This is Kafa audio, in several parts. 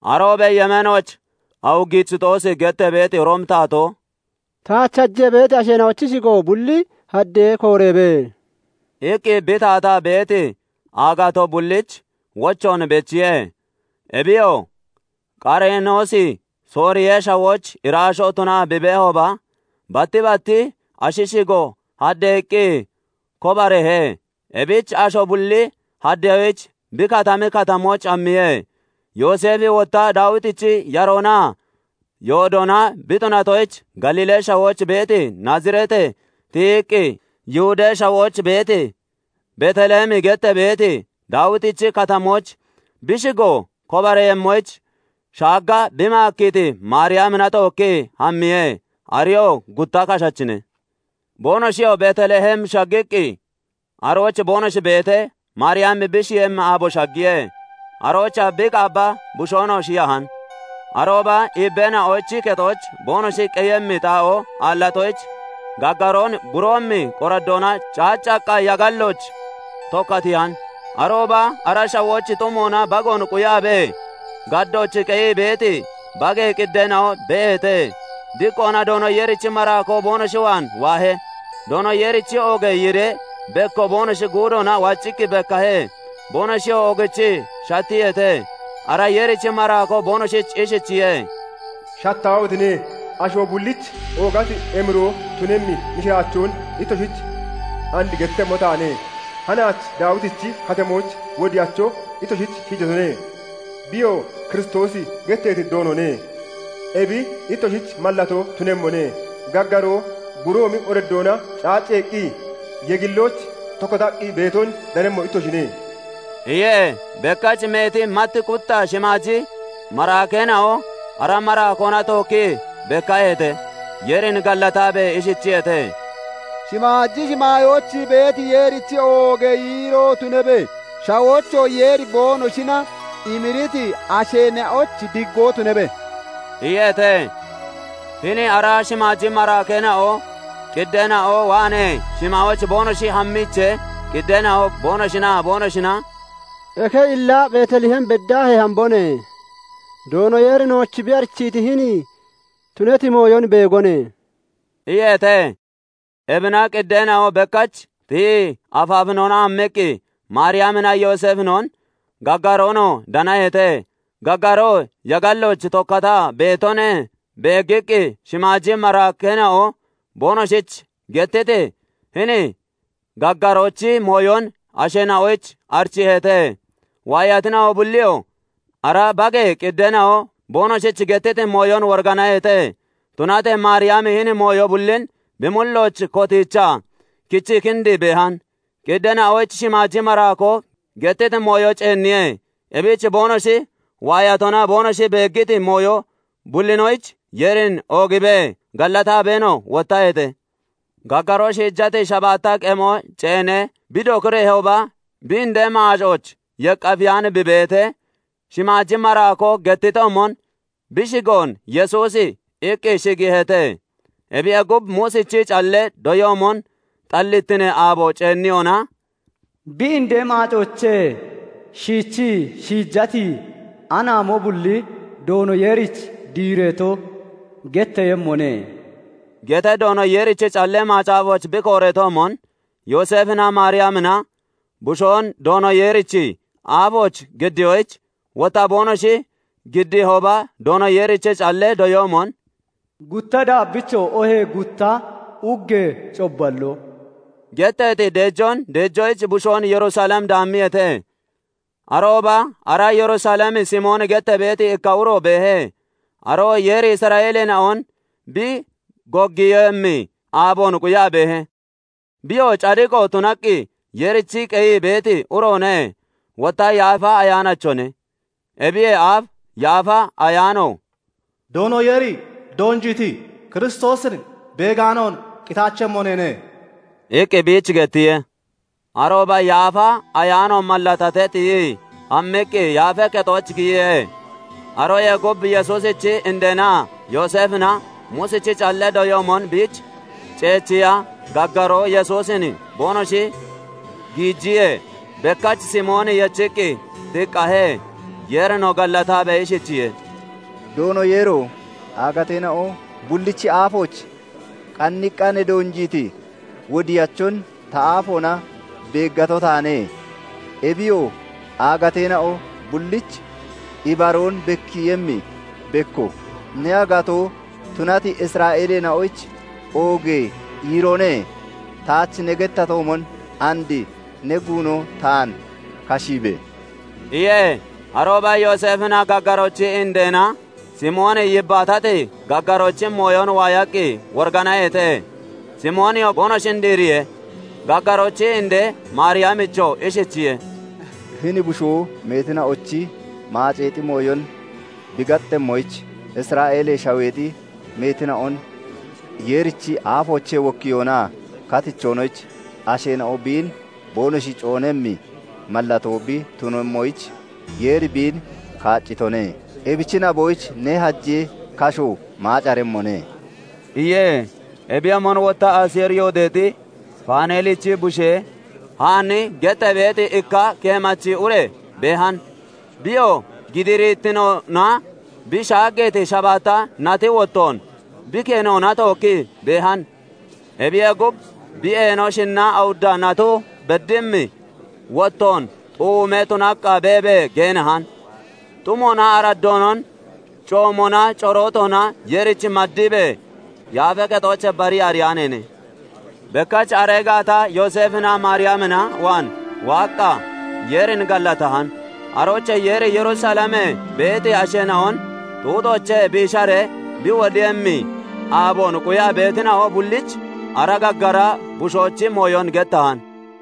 Aroobee yemeenooch Awugisixoosi gettee beeti Roomi taatoo "Taach hajee beeti asheena'ochi shigo bulli haddee kobareebe!" iqqi bi taataa beeti aagatoo bulliich wochoon bechiye. Ebiyoo Qareenoosi Sooriyee shawooch iraashoo tunaa bi beehooba, batti bat ashi shigo haddeeqqi kobareehe. Ebich asho bulli haddeyoyich bi katami katamooch hammiye. Yooseefi wotta Daawitichi yaroonaa yoodoona bi tunatoyich, Galiilee shawooch beeti Naazireetee tiyiqqi, Yihudee Shawooch beeti Beet Lehemi gettee beeti Daawitichi Katamooch, bi shigo kobareeyemmoyich, shaagga bi maakkiiti Maariyamina tookkii hammiye; areyoo gutta kashachine. Boonoshiyoo Beet Lehem shaggiqqi arooch boonoshi beetee, Maariyami bi shiyemmi aabo shaggiye. Aroochaa bi qaabba bushoonoo shiyahan. Arooba iibbeena'och kexooch boonoshi qeyemmi xaa'oo aallatoyich, gaggaroon buroomi qoraddoona caaccaqqa yagallooch (yegillooch) tokkatiihan. Arooba ara shawooch xumoona bagoon quyaabee gaddooch qeyii beeti bagee qiddeena'o beeheete. Diqqoona Doono Yeerichi maraakoo boonoshi waan waahe; Doono Yeerichi oogee yiiree bekko boonoshi guudoona waccii bekkahe; boonoshiyoo oogichii shattiyeete. Ara Yeerichi maraakoo boonoshich ishichiye:- "Shattaahotine! Asho bullich oogati emiroo tunemmi mishiraachoon ittoshich and gettemmo taane; Hanaach Daawitichi Katamooch wodiyacho ittoshich shiijatone; biyoo Kiristoosi getteeti Doonone. Ebi ittoshich mallatoo tunemmone; gaggaroo buroomi qoraddoona caacceeqqi, yagallooch (yegillooch) tokkataqqi beeton danemmo ittoshine" iye. Bekkach meeti mat qutta shimaaji maraakeena'o ara maraakoona tookkii bekkaheete; Yeerin gallataabee ishichiyeete:- "Shimaaji shimaayooch beeti Yeerich oogee yiiroo tunabe! shawoochoo Yeeri boonoshina emiriti asheena'oyich diggoo tunabe!" iyeete. Hini ara shimaaji maraakeena'o qiddeena'o waanee shimaayooch boonoshi hammiichee, qiddeena'o boonoshinaa boonoshina "Eke illa Beet Lehem beddaahee hambone; Doono Yeeri nooch bi arichiiti hini tunati mooyon beegone" iyeete. Ebina qiddeena'o bekkach tiyii afaafinoona hammiqqi Maariyaminaa Yooseefinon, gaggaroonoo danaheete; gaggaroo yagallooch tokkataa beetone; Beeggiqqi, shimaaji maraakeena'o boonoshich gettiti hini gaggaroochi mooyon asheena'oyich arichiiheete. Waayatina'o bulliyoo ara bagee qiddeena'o boonoshich gettiti mooyon woriganaheete. Tunatee Maariyami hini mooyo bullin bi mullooch kotiichaa kichii kindii beehan. Qiddeena'oyich shimaaji maraakoo gettiti mooyo ceenniye; ebich boonoshi waayatonaa boonoshi beeggiti mooyo bullinoyich Yeerin oogiibee, gallataabeenoo wottaheete. Gaggaroo shiijati shabaatta qemo ceenee bi dokireehooba, bi indee maacooch yeqqafeyaani bi beetee shimaaji maraakoo gettitoomon, bi shigoon "Yesuusi" iqqi shigiiheete. Ebiyee gub, Muusichi callee doyoomon xallitinee aabo ceenniyona, "Bi indee maacoochee shiichii shiijati anaamo bulli Doono Yeerich diireto getteeyemmone" gettee Doono Yeerichi Callee Macaafooch bi kooreetoomon Yooseefinaa Maariyamina bushoon Doono Yeerichi aafooch giddiyoyich, wotta boonoshi giddiihooba Doono Yeerichi callee doyoomon "Gutta daabbicho oohee gutta uggee cobballoo" getteeti deejoon deejoyich bushoon Yerusalem daammiyeete. Arooba ara Yerusalem Simooni gettee beeti ikka uro beehe; aroo Yeeri Isra'eeleena'on bi goggiiyemmi aaboon quyaa beehe; biyoo cadiqo tunaqqi Yeerich qeyii beeti uroone; wotta Yaafa Ayaanachone. Ebiyee aaf Yaafa Ayaano "Doono Yeeri doonjiiti Kiristoosin beegaanoon qitaachemmo neene" iqqi biich gettiye. Arooba Yaafa Ayaano mallatatee, tiyii hammiqqi Yaafee Kexooch giyiye. Aroyee gub Yesuusichi indeenaa Yooseefina Muusichi callee doyoon biich ceechiya gaggaroo Yesuusin boonoshi giijiyee, bekkach Simooni yechiqqi tiqqahe; Yeerinoo gallataabee ishichiye:- "Doono Yeero! Aagateena'o bullichi aafooch qanniiqqaa ne doonjiiti wodiyachon ta aafoona beeggato taane; ebiyoo aagateena'o bullich ibaroon bekkiiyemmi bekko, ne aagatoo tunati Isra'eeleena'oyich oogee yiiroone; taach ne gettatoomon and ne guuno taan kashiibe!" iye. Arooba Yooseefinaa gaggaroochi indeena Simooni yibbaatati gaggaroochi mooyon waayaqqi woriganaheete. Simooniyoo boonoshin diiriye; gaggaroochi indee Maariyamichoo ishichiye:- "Hini bushoo meetina'ochi maaceexi mooyon bi gaxemmoyich, Isra'eelee Shaweexi meetina'on Yeerichi aafoochee wokkiyoonaa katichoonoyich, asheena'o biin boonoshi coonemmi mallatoo bi tunemmoyich, Yeeri biin kaaccitone; ebichi naboyich ne hajee kasho maacaremmone" iye. Ebiyoomon wotta Aseeri yoodeexi Faaneelichi bushee Haanni gettee beeti ikka keemachi ure beehan; biyoo gidiirittinoona bi shaaggeeti shabaatta nati wottoon bi kenoona tookkii beehan. Ebiyee gub, bi eeno shinnaa awudda nato beddimmi wottoon xuumee tunaqqa beebee geenahan; xumoonaa araddoonon coomoonaa corootoona Yeerichi maddiibee, Yaafee Kexoochee barii ariyaaneene. Bekkach aree gaata Yooseefinaa Maariyamina waan waaqqa Yeerin gallatahan; aroochee Yeeri Yerusalem beeti asheena'on xuuxoochee biisharee bi wodiiyemmi aaboon quyaa beetina'o bullich ara gaggara bushoochi mooyon gettahan.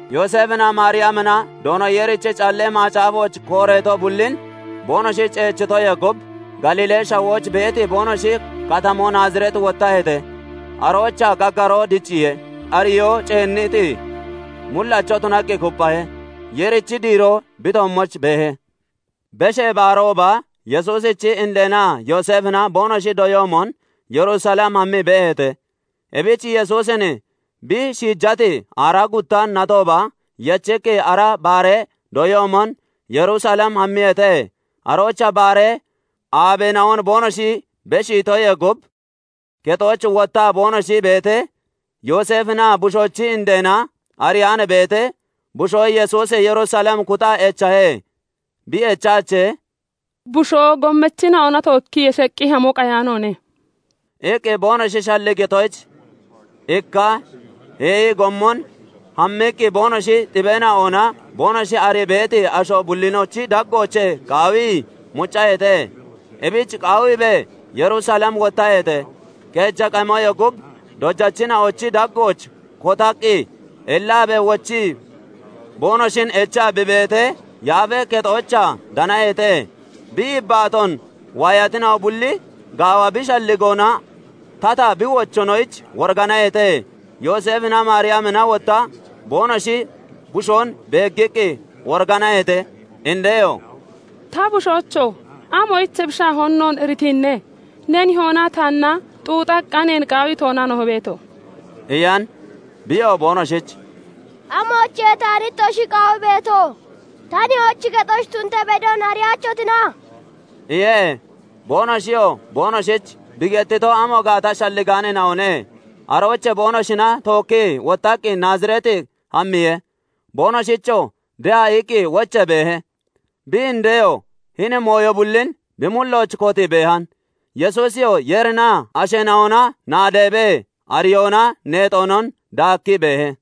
Yooseefinaa Maariyamina Doono Yeerichi Callee Macaafooch kooreeto bullin boonoshi ceechitoyee gub, Galiilee Shawooch beeti boonoshi katamoo Naazireet wottaheete. Aroochaa gaggaroo dicciye; ariyoo ceenniti mullacho tunaqqi kupphahe; Yeerichi diiroo bi toommooch beehe. Beshee Baarooba, Yesuusichi indeenaa Yooseefina boonoshi doyoomon Yerusalem hammii beeheete; Ebich Yesuusin bi shiijati aaraa gutta natooba yechiqqi ara baaree doyoomon Yerusalem hammiyeete. Aroochaa baaree aabeena'on boonoshi beshiitoyee gub kexooch wottaa boonoshi beetee, Yooseefinaa bushoochi indeena ariyaan beetee, bushoo Yesuusi Yerusalem kuxaa echahe. Bi echaachee, "Bushoo gommachina'ona tookkii yeshaqqi hamo qayaanoone" iqqi boonoshi shalligitoyich, ikka heeyi gommon hammiqqi boonoshi xibeena'onaa boonoshi arii beeti asho bullinochi daggooch qaawii muccaheete; ebich qaawiibee Yerusalem wottaheete. Keeja qemoyee gub dojachina'ochi daggooch kotaqqi ellaabee wochii boonoshin echaa bi beetee, Yaafee Kexoochaa danaheete. Bi yibbaatoon waayatina'o bulli gaawa bi shalligoonaa tata bi wochoonoyich woriganaheete. Yooseefinaa Maariyamina wotta boonoshi bushoon beeggiqqi woriganaheete. Indeyoo "Ta bushoocho! Amoyich ebi shaahoon noon iritiine? Ne nihoonaa taanna xuuxaqqa neen qaawii toona no beeto?" iyan. Biyoo boonoshich "Amoyichiye taan ittoshi qaawii beeto? Ta nihoochi kexooch tun ta bedon ariyaachotina?" iye. Boonoshiyoo boonoshich bi gettito amo gaata shalligaaneena'one. Aroochee boonoshina tookkii wottaqqi Naazireet hammiye. Boonoshichoo de'a iqqi wochee beehe. Bi indeyoo hini mooyo bullin bi mullooch kotii beehan. Yesuusiyoo Yeerinaa asheena'ona naadeebee, ariyoonaa neexoonon daakkii beehe.